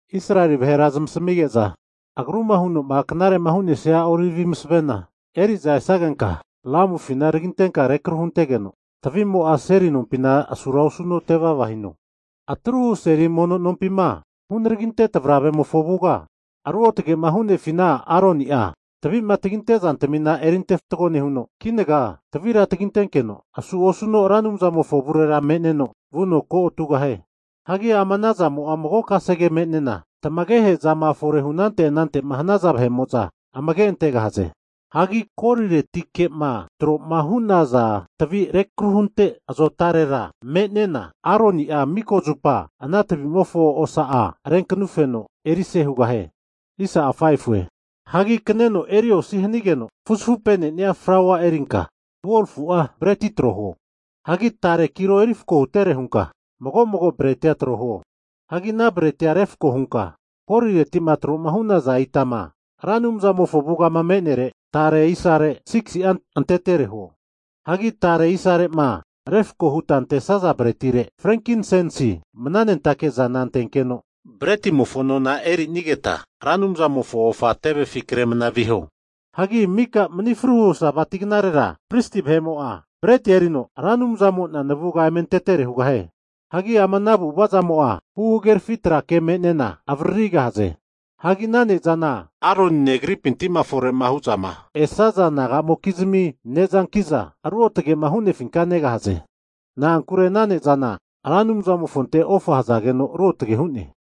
Israeli vahera zmasamige'za agruma huno'ma knare'ma hu'nesia olivi masavena eri'za esagenka, lamufina tagintenka rekru huntegeno tavi'mo'a seli nompina asura osuno tevava hino. Atruhu seli mono nompima hunaragi tavravemofo avuga, ruotage hu'nefina Aroni'a tavima taginte zantamina eri ante fatgo nehuno, kinaga tavira tagintenkeno asu osuno Ra Anumzamofo avurera me'neno vuno kotugahie. Hagi ama anazamo'a mago kasege me'nena tamagehezama fore hu anante anante'ma hanaza vahe'mo'za amage antegahaze. Hagi goliretike'ma tro'ma hu'naza tavi rekruhunte azotarera, tavira me'nena Aroni'a miko zupa ana tavimofo osa'a renkanufeno erise hugahie. Hagi kaneno eri osi hanigeno fuzafupenenia flaua erinka 12fu'a breti trohuo. Hagi tare kilo eri fako hutere hunka, mago mago bretia trohuo. Hagi ana bretia refako hunka golireti'ma tro'ma hu'naza itama Ra Anumzamofo avugama me'nere tare isare 6si'a antetere huo. Hagi tare isare'ma refko huta antesaza bretire frenkinsensi mnanentake zana antekeno bretimofo nona erinigeta Ra Anumzamofo ofa tevefi kre mna viho. Hagi mika mani fruhu Sabati knarera pristi vahe'mo'a bretia erino, Ra Anumzamo'na navuga eme antetere hugahie. Hagi ama ana avu'avazamo'a, huhagerafi tra ke me'nena avaririgahaze. Hagi ana ne'zana Aronine agripinti'ma fore hu'zama esaza naga'mokizmi ne'zankiza, ruotage'ma hu'nefinka negahaze. Na'ankure ana ne'zana Ra Anumzamofonte ofa hazageno ruotage hu'ne.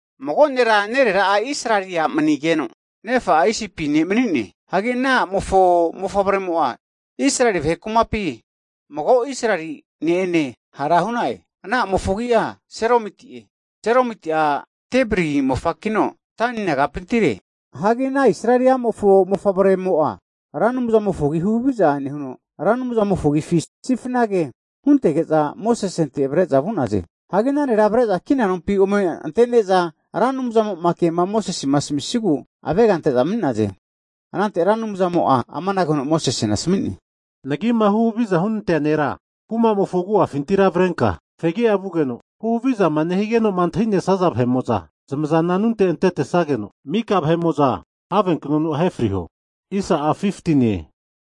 Mago nera nerera'a Israeli a' manigeno, nefa'a Isipi ne' mani'ne. Hagi ana ne'mo'a Israeli vahe kumapi mago Israeli ne'ene hara hu'na'e. Ana a'mofo agi'a Selomiti'e. Selomiti'a Dibri mofakino Dani nagapintire. Hagi ana Israeli a'mofo mofavremo'a Ra Anumzamofo agi huhaviza nehuno, Ra Anumzamofo agifi sifna ke huntege'za Mosesente avre'za vu'naze. Hagi ana nera avre'za kina nompi ome ante'ne'za, Ra Anumzamo'ma kema Mosesema asaminigu avega ante'za mani'naze. Anante Ra Anumzamo'a amanage huno Mosesena asami'ne, nagima huhavizama hunante'nea nera kumamofo agu'afintira avrenka fegi'a vugeno, huhavizama nehanige'zama antahi'nesaza vahe'mo'za zmazana anunte antetesageno, miko vahe'mo'za have knonu ahe friho.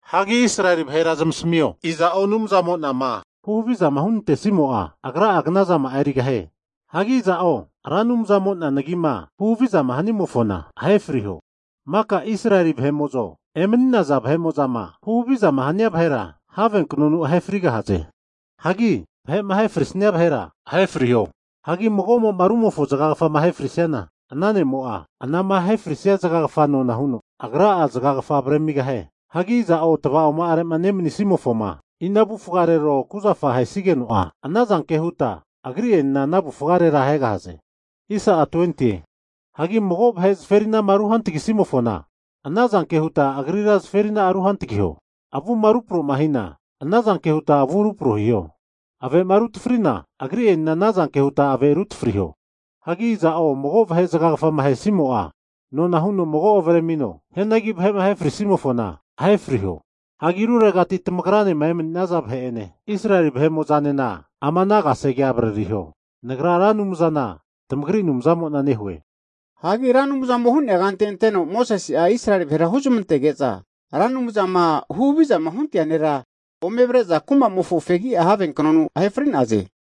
Hagi Israeli vahera zamasamio, iza'o Anumzamo'nama huhavizama hunantesimo'a, agra'a knazama'a erigahie. Hagi iza'o Ra Anumzamo'na nagima huhavizama hanimofona ahe friho. Maka Israeli vahe'mo'zo emani'nenaza vahe'mo'zama huhavizama hanazana vahera havenknonu zamahe frigahaze. Hagi vahe'ma ahe frisnia vahera ahe friho. Hagi mago'mo'ma rumofo zagagafama ahe frisiana, ana ne'mo'a, anama ahefrisia zagagafa nona huno agra'a zagagafa avremigahie. Hagi iza'o tava'oma'are'ma nemanismofoma ina avufgarero kuzafa ahesigeno'a, ana zanke huta agri'enena ana avufgarera ahegahaze. Hagi mago vahe zaferinama ruhantagisimofona, ana zanke huta agrira zaferina'a ruhantagiho. Avuma ruproma hina, ana zanke huta avu rupro hiho. Ave'ma rutafrina, agri'enena ana zanke huta ave rutafriho. Hagi iza'o mago vahe zagagafama ahesimo'a, nona huno mago avaremino. Hianagi vahe'ma ahe frisimofona, ahe friho. Hagi ruregati'ma tamagranema emani'nesaza vahe'ene Israeli vahe'mo'zanena ama ana kasegea avaririho. Nagra Ra Anumzana tamagri Anumzamo'na nehue. Hagi Ra Anumzamo'ma hu'nea kante anteno Mosese'a Israeli vahera huzmantege'za, Ra Anumzama huhavizama huntea nera ome avre'za kumamofo fegia havenknonu ome ahe fri'naze.